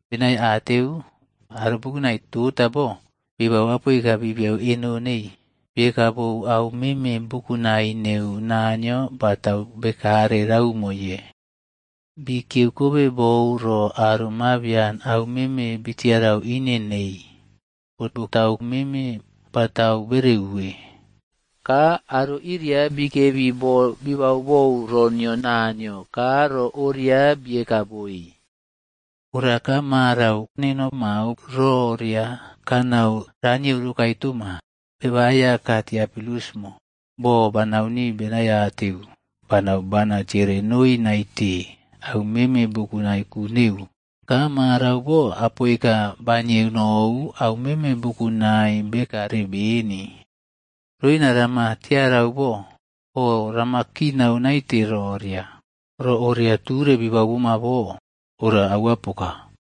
benaiateu aro bukunai tota bo, bibau apoika bibiyeu eno neii, bieka bou au meme bukunai neu Naniyo batau bekare raumoye. Bikiyeu kobe bou ro aro mabian au meme bitiarau ine nei, neu roporae orara au meme batau bereuwe. Ka aro iria bikebi boo bibau bou ro nio Naniyo, ka ro oria bieka boi. Ora ka marau neno mao ro oria kanau ranieu rokae toma. Beba Aiyaka Tiofilusꞌmo. Boo banau nii benaiateu, banau bana tiere noi naite, au meme bukunai ku neu. Ka marau bo apoika banieu nou, au meme bukunai bekare beni. Roina rama tiarau bo, oꞌrama kinau naite roria, ro oria ture bibau boma bo, ora aua poka.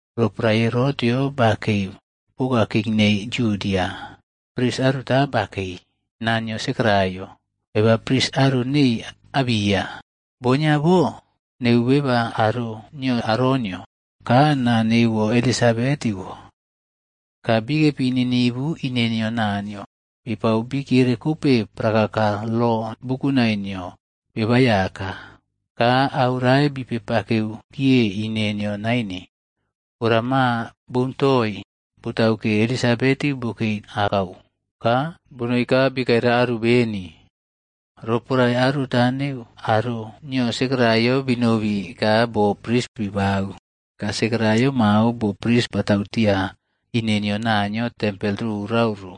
Roporae Herotꞌyob bakei poka king nei Yudia, pris aruta bakei, naa nio Sekaraiaꞌyo. Beba pris aro neii Abiya. Bon nio bo neu beba aro nio Aronꞌyo,c ka naa neuwo Elisabetiꞌwo. Ka bikepi ninivu ine nio Naniyo. Bipau bikiere kope prakaka lo bukunai nio Beba Aiyaka. Ka au rae bipepakeu kiye ine nio naine. Ora maa boun toii, botau ke, Elisabetiꞌwo bokei akau. Ka bonoi ka bikaira aru beni. Sekariad Roporae aruta neu aro nio Sekaraiaꞌyo binobi ka boo pris bibau, ka Sekaraiaꞌyo mao boo pris batau tia ine nio Naniyo tempel rorau ro.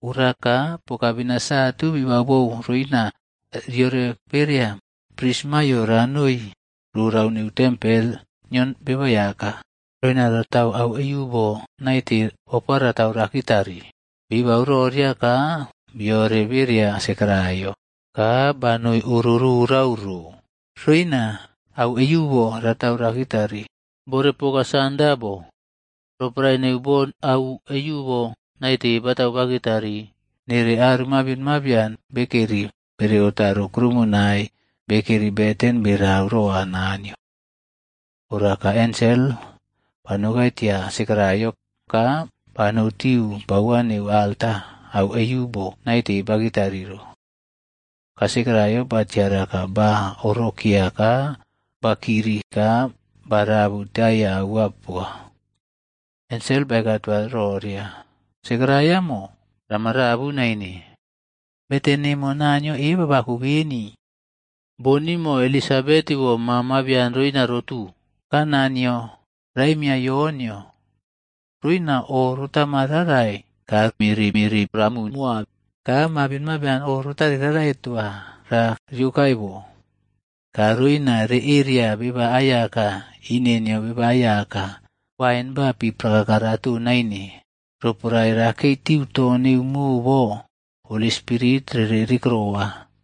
Ora ka pokabena satu bibau bou roina ke riore bereya pris maiyo ranoi rorau neu tempel nio Beba Aiyaka, roina ratau au eiꞌubo naite ofa ratau rakitari. Bibau roria ka biore beria Sekaraiaꞌyo, ka banoi oro rorau ro, roina au eiꞌubo rakitari bore poka sanda bo. Roporae neu bo au eiꞌubo naite batau bakitari, nere aro mabion mabian bekeri bere otaro kuroumonai bekeri beten berere roa Naniyo. Ora ka ensel banoukai tia Sekaraiaꞌyo, ka banoutiu paua neu alta au eiꞌubo naite bakitari ro. Ka Sekaraiaꞌyo batiara ka baꞌorokeya ka bakiri ka barabu taiya aua poka. Ensel baeka toa roria, “Sekaraiaꞌmo, rama rabu naine. Beten nemo Naniyo eba bako beni. Bon nimo Elisabetiꞌwo ma mabian roina rotu, ka naa nio raemiya Yonꞌyo. Roina o rotama rarai, ka miriꞌmiri ramu moa, ka mabion mabian o rotare rarai toa ra riokae bo. Ka roina reꞌeriya beba aiyaka ine nio Beba Aiyaka. Wain ba pi prakaka raton naine. Roporae rakei tiu to neu mo bo, Holi Spirit rere rikeroa.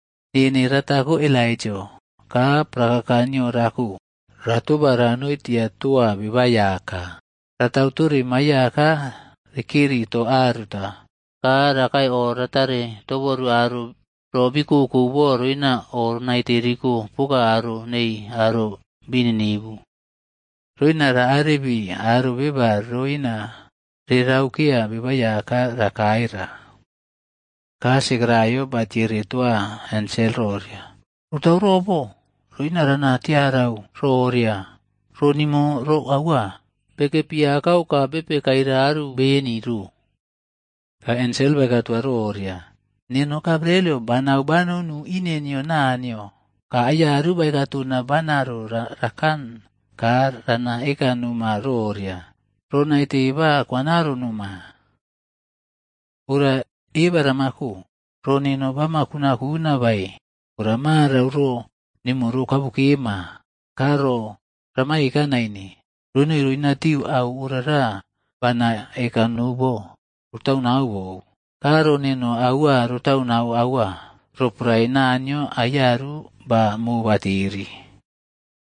Nene ratako Elaijaꞌo ka prakaka nio rako, ratoba ranoi tia toa Beba Aiyaka. Ratau tore maiꞌyaka rekeri to aruta. Ka rakae o ratare toboru aro ro bii kokou bo roina o naite riko poka o nei aro bii ninivu. Roina ra arebire aro beba roina reraukeya Beba Aiyaka rakae ra.” Ka Sekaraiaꞌyo batiere toa ensel roria, “Rotau robo, roina rana tiarau roria, ro nimo ro aua?” Bekepi akau ka bepe kaira aru beni ro. Ka ensel baeka toa roria, “Neno Gabrielꞌyo, banau banonu nia ine nio Naniyo, ka Aiyaru baeka tona banaro rakan ka rana eka noma roria, ro naite ba kwanaro noma. Ora eba ramako. Ro neno bamana kunaꞌkuna bae ora marau ro nemo ro kabukema ka ro rama eka naine, ronoi roinatiu auꞌorara bana eka nou bo, rotaunau bou. Ka ro neno aua rotau nau roporae Naniyo aiyaru ba mobateri.”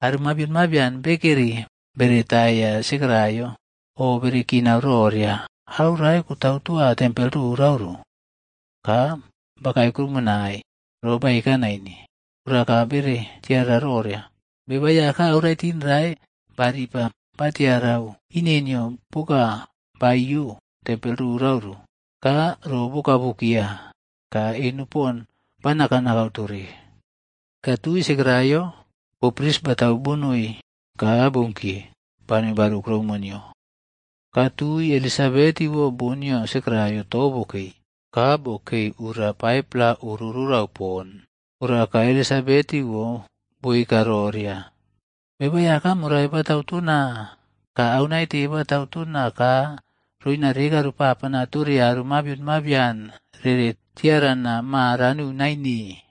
Aro mabion mabian bekeri beretaiya Sekaraiaꞌyo, oꞌbere kinau roria au rae kotau toa tempel rorau ro. Ka bakae kuroumonai, ro baeka naine. Ora ka bere tiarau roria, Beba Aiyaka auraitin rae baripa batiarau ine nio poka ba iyo tempel rorau ro. Ka ro bokabukeya, ka eno pon ba nakaꞌnakau tore. Ka tui Sekaraiaꞌyo bo pris batau bonoi ka bounkiye, banoi baru kuroumo nio. Ka tui Elisabetiꞌwo, bon nio Sekakaiaꞌyo to bokei, ka bokei ura 5-pla oro rorau poni. Ora ka Elisabetiꞌwo boeka roria, “Beba Aiyaka morai batau tona ka au naite batau tona ka roina reka ropapanae tore aro mabion mabian rere tiarana maa ranu naine.”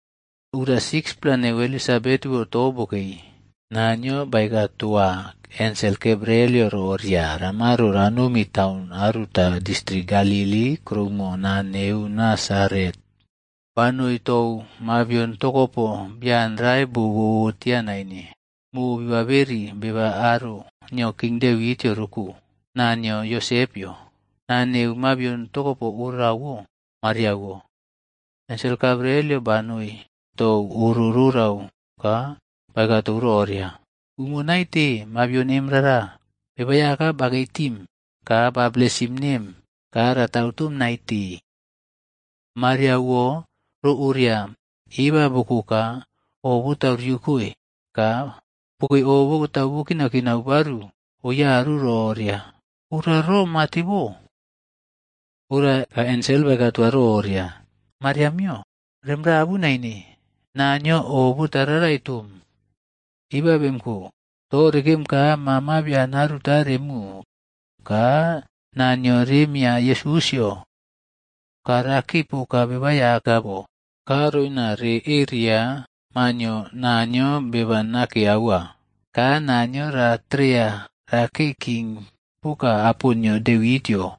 Ura 6-pla neu Elisabetiꞌwo to bokei. Naniyo baeka toa ensel Gabrielꞌyo roria ramaro ranomi taun aruta distrik Galili kuroumo naa neu Nasaret. Banoi tou mabion tokopo bian rae bo bobo tia naine, mobibauberi beba aro nio king Devitꞌyo roko. Naa nio Yosepꞌyo. Naa neu mabion tokopo orawo Mariaꞌwo. Ensel Gabrielꞌyo banoi tou oro rorau ka baeka tou roria, “Umo naite mabion emꞌra. Beba Aiyaka bakei tim, ka ba blesim nem ka ratautom naite.” Mariaꞌwo ro oria eba boko ka, o botau riokoe ka bokei o batau bokinaꞌkina baru oyaru ro orara, “Ora ro mate bo?” Ora ka ensel baeka tou roria, “Mariaꞌmio, rem rabu naine. Naniyo o botararai toom. Eba bemꞌko, to rekem ka ma mabian aruta remu. Ka naa nio remiya Yesusꞌyo. Ka rakei poka bebaꞌaiyaka bo. Ka roina re eria ma nio Naniyo Beba Nake Aua. Ka Naniyo ratereya rakei king poka apo nio Devitꞌyo.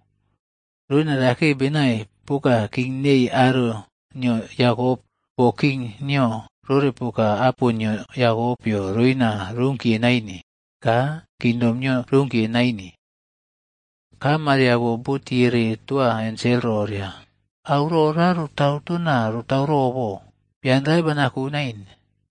Roina rakei benai poka king nei aro nio Yakop, boo king nio rore poka apo nio Yakopꞌyo roina roukiye naine. Ka kingdom nio rounkiye naine.” Ka Mariaꞌwo botiere toa ensel roria, “Au rora rotau tona rotau robo? Bian rae banako naine.”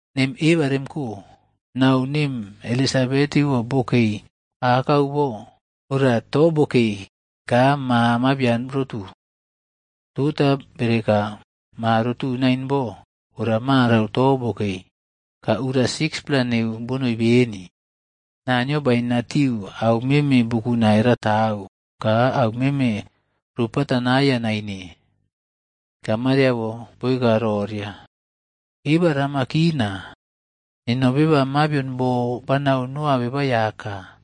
Nem eba remko, nau nem Elisabetiꞌwo bokei akau bo, ora to bokei ka ma mabian rotu. Tota bere eka ma rotu nain bo. Ora marau to bokei, ka Ura 6-pla neu bonoi beni. Naniyo bainatiu au meme bukunai ratau, ka au meme ropatanaiya naine.” Ka Mariaꞌwo boeka roria, “Eba rama kina. Neno beba mabion bo banau noa Beba Aiyaka.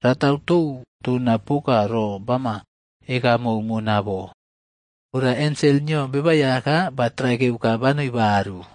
Ratau tou tona poka ro bama eka mou mona bo.” Ora ensel nio Beba Aiyaka batraikeu ka banoi baru.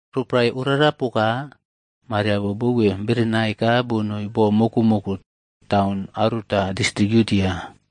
Roporae orara poka, Mariaꞌwo bouwe berenai ka bonoi bo mokoꞌmoko, taun aruta distrik Yudia.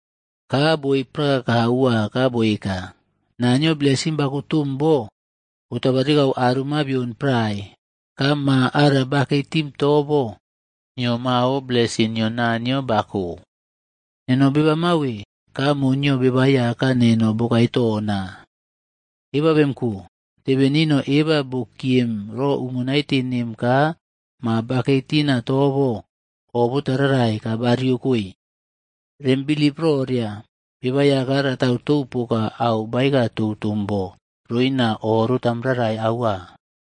ka boei prakaka aua ka boeka, “Naniyo blesim bako tom bo botabarikau aro mabion prae. Ka ma ara kakei tim to bo, nio mao blesim nio Naniyo bako. Neno beba mawe, ka mo nio Beba Aiyaka neno bokae tona? Eba bemko, tebe nino eba bokiem ro umo naite nem ka ma bakei tina to bo oꞌbotarai ka bariokoe. Rem bilip roria Beba Aiyaka ratau tou poka au baeka tou tom bo roina o rotam rarai aua.”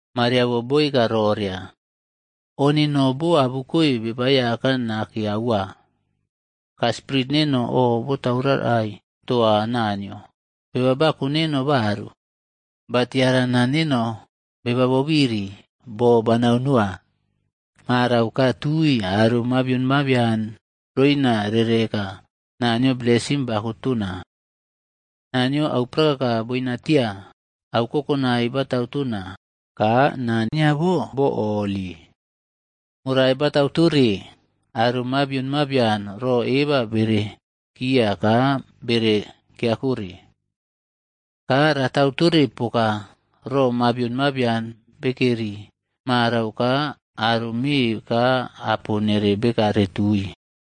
Mariaꞌwo boeka roria, “O neno bo abukoe Beba Aiyaka nake aua. Ka spirit neno o botaurarai toa Naniyo, beba bako neo baru. Ba tiarana neno beba bobiri, boo banau noa. Marau ka tui aro mabion mabian roina rereꞌeka Naniyo blesim bako tona. Naniyo au prakaka boinatia, au kokonai batau tona. Ka naa nio bo holi. Morai batatau tore aro mabion mabian ro eba bere kiya ka bere kiakore. Ka ratau tore poka rora mabion mabian bekeri marau ka aro me ka apo nere rekare tui.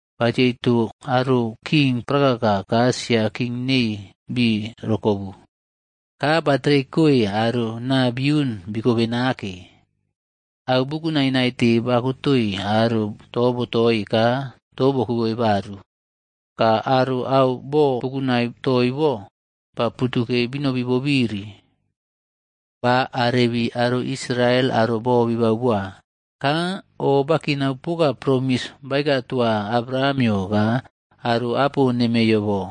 Batieito aro king prakaka ka sia king nei bii rokobu, ka ba tereikoe aro naa biun bikobe nake. Au bukunai naite bakotoi aro tobotoi ka to bokiboi baru. Ka aro au bobukunai toii bo, ba putukei binobi bobiri. Ba arebii aro Israel, aro bo bibau boa. Ka o bakinau poka promis baeka toa Abrahamꞌyo ka aro apo nemeiyo bo,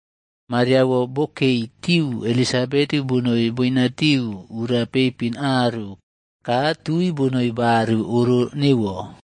Mariaꞌwo bokei tiu Elisabetiꞌwo bonoi boinatiu ura peipin aru, ka tui bonoi baru oro neuwo.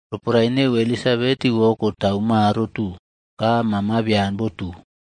Roporae neu Elisabetiꞌwo kotau ma rotu, ka ma mabian botu.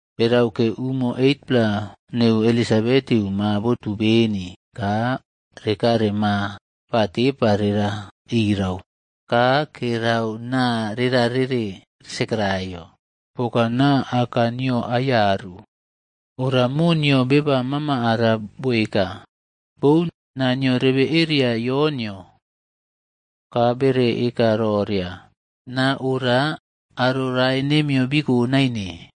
Beraukeu umo 8-pla neu Elisabetiꞌwo ma botu beni, ka rekare ma ba tepa rera irau, ka kerau naa rera rere Sekeraiaꞌyo, poka naa aka nio aiyaru. Ora mo nio beba mama ara boeka, “Boun. Na nio rebe eria Yonꞌyo.” Ka bere eka roria, “Naa ora aro rae nemiyo biko naine.”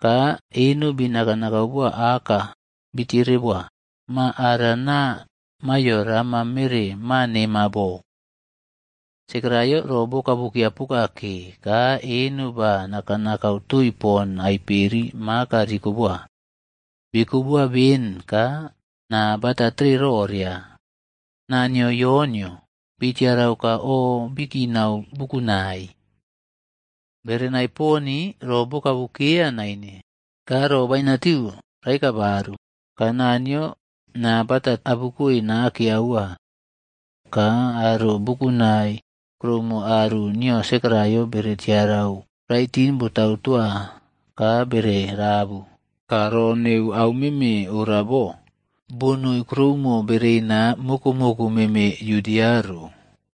Ka eno bi nakaꞌnakau boa aka, bitiere boa, ma ara naa maiyo rama mere ma nemo bo. Sekaraiaꞌyo ro bokabukeya poka ke ka eno ba nakaꞌnakau toii pon aiperi maka rikoboa. Biꞌkoboa ben ka naa batatere roria, “naa nio Yonꞌyo” bitiarau ka o bikinau bukunai. Berenai poni ro bokabukeya naine, ka ro bainatiu raeka baru, ka Naniyo naa bata abukoe nake aua. Ka aro bukunai kuroumo aru niyo Sekaraiaꞌyo bere tiara au raitin botau toa ka bere rabu. Ka ro neu au meme ora bo, bonoi kuroumo bereina mokoꞌmoko meme Yudia ro.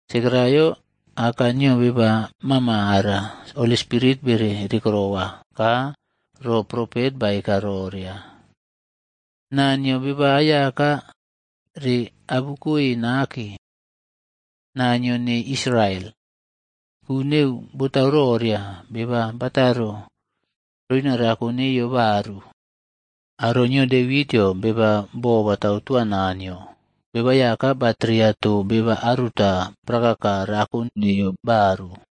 Sekaraiaꞌyo, aka nio beba mama ara Holi Spirit bere rikerowa, ka ro propet baeka roria, “Naa nio Beba Aiyaka reꞌabukoi nake, Naniyo nei Israel. Ku neu botau roria, beba bataro roina rako neiye baru. Aro nio Devitꞌyo, beba bo batau toa Naniyo, Beba Aiyaka batereya to beba aruta prakaka rako neiyo baru,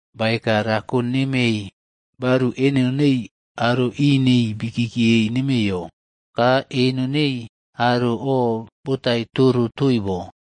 Baeka rako nemei baru eno nei aro ineii bikieiye nemeiyo. Ka eno nei aro o botai toro toii bo.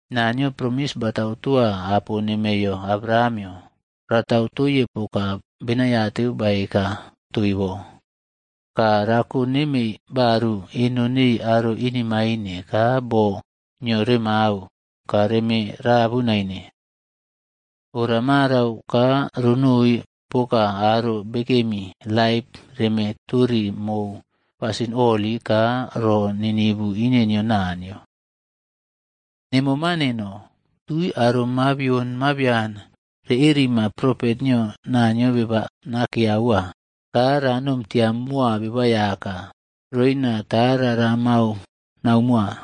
Naniyo promis batau toa apo nemei Abrahamꞌyo. Ratau toiye poka benaiateu baeka toii bo. Ka rako nemei baru eno nei aro inemain ka boo nio remau, ka reme rabu naine. Ora marau ka ronoi poka aro bekemi laip reme tori mou pasin holi ka ro ninivu ine nio Naniyo. Nemo ma neno, tui aro mabion mabian reꞌerima propet nio Naniyo Beba Nake Aua. Ka ranom tia moa Beba Aiyaka, roina tara ramau nau moa.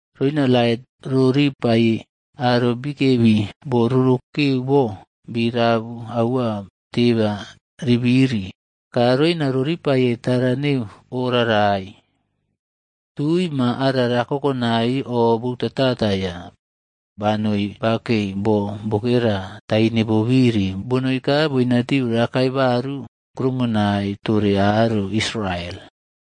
roina lait roripai aro bikebi bo rorokeu bo, birabu aua teba ribiri, ka roina raripaiye tara neu orarai.” Tui ma ara ra kokonai, o boutataiya. Banoi bakei bo bokera taine bobiri, bonoi ka boinatiu rakae baru kroumonai tore aro Israel.